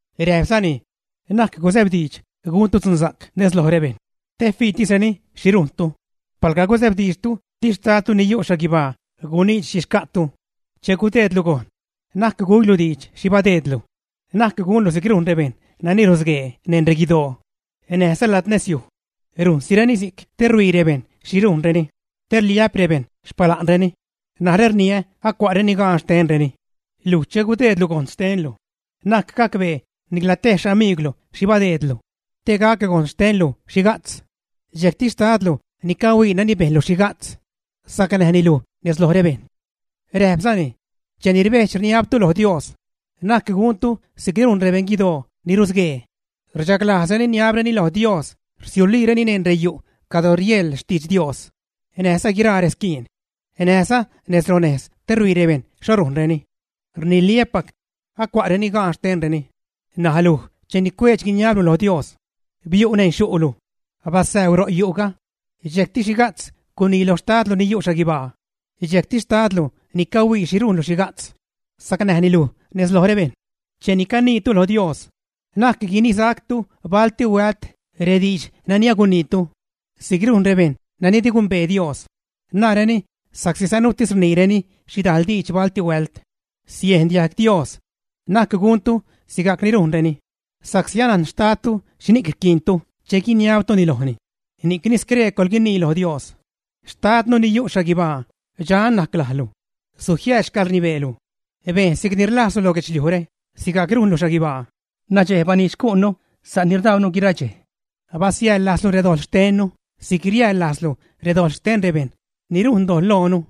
Räjpzani: ―Na'c gusäbdiidx guntu dzunsa'c nez loj rebejṉ te fiitisreni xhi rujntu. Palga gusäbdiidxtu di xtadtu ni yu' xhaguibaa guniidx xhi xca'tu. Che gudeedlu gojn, na'c güilu diidx xhi badeedlu. Na'c gunlu si'c rujn rebejṉ nani rusguee neṉ reguidoo, näjza lad nezyuj. Rujnsireni si'c te ruhuii rebejṉ xhi rujnreni te rliä'p rebejṉ xpala'nreni. Narä rniä acua'reni gaan xtenreni. Luj che gudeedlu gojn xtenlu, na'c gacbee nicla tej xamiigwlu xhi badeedlu, te gac gojn xtenlu xhiga'tz. Dxejcti xtadlu ni cahuii nani bejnlu xhiga'tz, sacnäjni luj nez loj rebejṉ. Räjpzani: ―Cheni rbejdx, rniabtu lo Dios, na'c guntu si'c rujn rebeṉguidoo ni rusguee. Rchaglajzreni rniabreni lo Dios rsiuliireni neṉ reyu' cadro rieḻ xtidx Dios, näjza guiraa resquiin, näjza nez ronejz te ruhuii rebejṉ xho rujnreni. Rniliä́pac, acua'reni gaan xtenreni. N̲aj luj cheni cueedx, guiniablu lo Dios, biu' neṉ xyu'lu. Basäuu ro' yu'ga, dxejcti xhiga'tz gunii loj xtadlu ni yu' xhaguibaa. Dxejcti xtadlu ni cahuii xhi rujnlu xhiga'tz, sacnäjni luj nez loj rebejṉ. ’Cheni caniitu lo Dios, na'c guinisactu balti huält rediidx nani aguniitu. Si'c rujn rebejṉ nani di gumbee Dios. Naareni sa'csi sanuutis rniireni xhidajl diidx balti huält, siejn diajg Dios. Na'c guntu sigajc ni rujnreni, sa'csi anajn xtadtu xhini'c rquiintu che guiniabtuni lojni. Ni'cni scree coḻguinii lo Dios: Xtadnu ni yu' xhaguibaa dxan najc lajlu. Sujiääd xcäḻrnibeelu; bejn si'cni rlajzlu lo guedxliujre sigajc rujnlu xhaguibaa. Nadxej baniidx xcu'nnu sa' ni rdaunu guira dxej. Basiäjḻ lajzlu redojḻ xtennu si'c riäjḻ lajznu redojḻ xten rebejṉ ni rujn dojḻ loonu.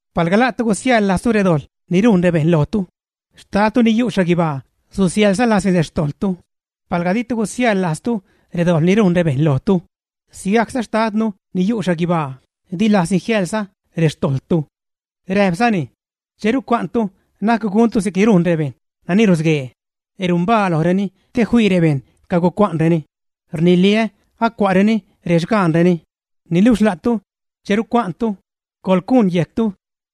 Palga la'tu gusiäjḻ lajztu redojḻ ni rujn rebejṉ lojtu, xtadtu ni yu' xhaguibaa susiäjḻza lajzni rextojḻtu. Palga ditu gusiäjḻ lajztu redojḻ ni rujn rebejṉ lojtu, sigajcza xtadnu ni yu' xhaguibaa di lajzni jiäjḻza rextojḻtu. Räjpzani: ―Che rucua'ntu na'c guntu si'c rujn rebejṉ nani rusguee; rumbaa lojreni te fii rebejṉ cagucua'nreni. Rniliä acua'reni rexgaanreni. Niluxh la'tu, che rucua'ntu, coḻcuṉ yejctu,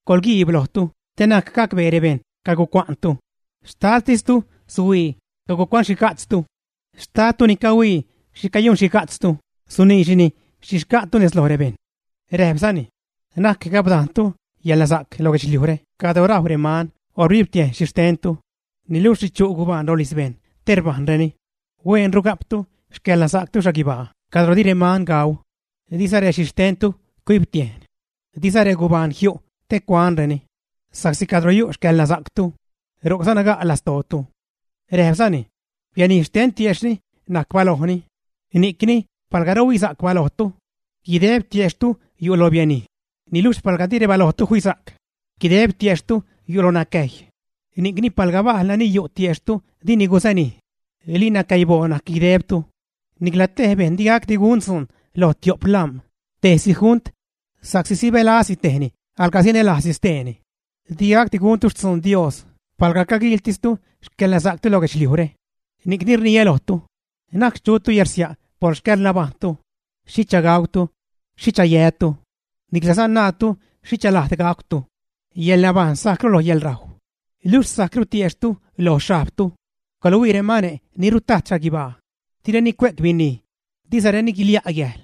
coḻquiib lojtu te na'c gacbee rebejṉ cagucua'ntu, xtadtistu suhuii cagucuanxhiga'tztu. Xtadtu ni cahuii xhi cayunxhiga'tztu suniidxni xhi xca'tu nez loj rebejṉ. Räjpzani: ―Na'c gapdajntu yäḻnasa'c lo guedxliujre cadro rajw reman o rbibtiejn xhixtentu, niluxh richu' gubaan rolijz bejṉ te rbajnreni. Hueenru ga'ptu xcäḻnasa'ctu xhaguibaa cadro di reman gauu, diza rexhixtentu cuibtiejn, diza regubaan jiu' te cuanreni. Sa'csi cadro yu' xcäḻnasa'ctu, ro'cza naga' lastootu. Räjpzani: ―Bianij xten tiejxhni najc balojni, ni'cni palga rhuisa'c balojtu, guideb tiejxhtu yu' lo bianij. Niluxh palga rebalojtu di fisa'c, guideb tiejxhtu yu' lo nacäjy, ni'cni palga bajl nani yu' tiejxhtu dini gusanij, ¡linacäiboo najc guidebtu! ’Nicla te bejṉ di gacdi gun dzuun loj tio'p lam̲ tejsi junt, sa'csi sibälazni tejni laga sanälajzni steeni. Digacdi guntu xtzuun Dios palga caguiiltistu xcäḻnasa'ctu lo guedxliujre. ’Ni'cni rniä lojtu, na'c chutu yärsia' por xcäḻnabajṉtu, xhicha gautu, xhicha yätu, niclaza naatu xhicha lajd gajcwtu. Yäḻnabajṉ sajcru lo yäḻrajw, luxh sajcru tiejxhtu lo xhajbtu. Coḻhuii remane' ni rtajt xhaguibaa. Direni cue'c binij, dizareni guilia' gäjl,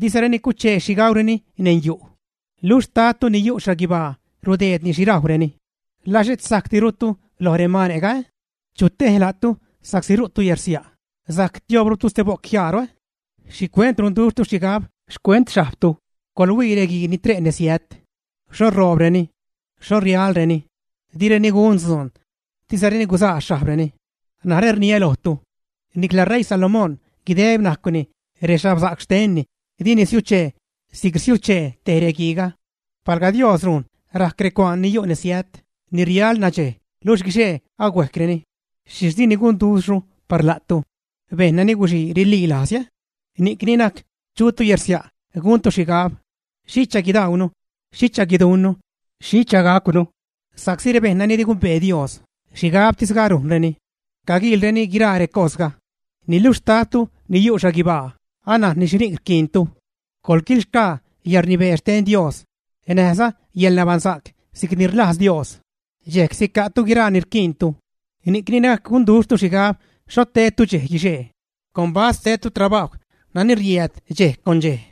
dizareni cuchee xhi gaureni neṉ yu', luxh xtadtu ni yu' xhaguibaa rudeedni xhi rajwreni. ¿Laa xhet sajcdirutu loj remane'ga, ä? ¿Chu tej la'tu sa'csi ru'tu yärsia' sajc tiobrutu ste bo'c jiaaru? ’¿Xhicuent runduxhtu xhigab xcuent xhajbtu? ¡Coḻhuii reguii ni tre' nesiät! ¿Xho roobreni? ¿Xho rialreni? Direni gun dzuun, dizareni guzaa xhajbreni. Narä rniä lojtu, nicla ṟeii Salomón guideb najcwni rexhabsa'c xtenni di nisiuchee si'c rsiuchee tej reguiiga. Palga Dios rujn rajc recuaan ni yu' nesiät ni rial nadxej luxh guixee ahuejcreni, ¿xhixh dini gunduxhru par la'tu, bejṉ nani guxii rililajz? Ni'cni na'c chutu yärsia' guntu xhigab: “¿Xhicha guidaunu, xhicha guiduṉnu, xhicha gacwnu?” Sa'csi rebejṉ nani di gumbee Dios xhigabtisga rujnreni, caguiilreni guiraa recosga. Niluxh xtadtu ni yu' xhaguibaa anajnni xhini'c rquiintu. Coḻquilxgaa yäḻrnibee xten Dios näjza yäḻnabaṉsa'c si'cni rlajz Dios dxejc sica'tu guiraa ni rquiintu. Ni'cni na'c gunduxhtu xhigab xho tedtu dxej guixee. Combast tedtu trabajw nani riääd dxej con dxej.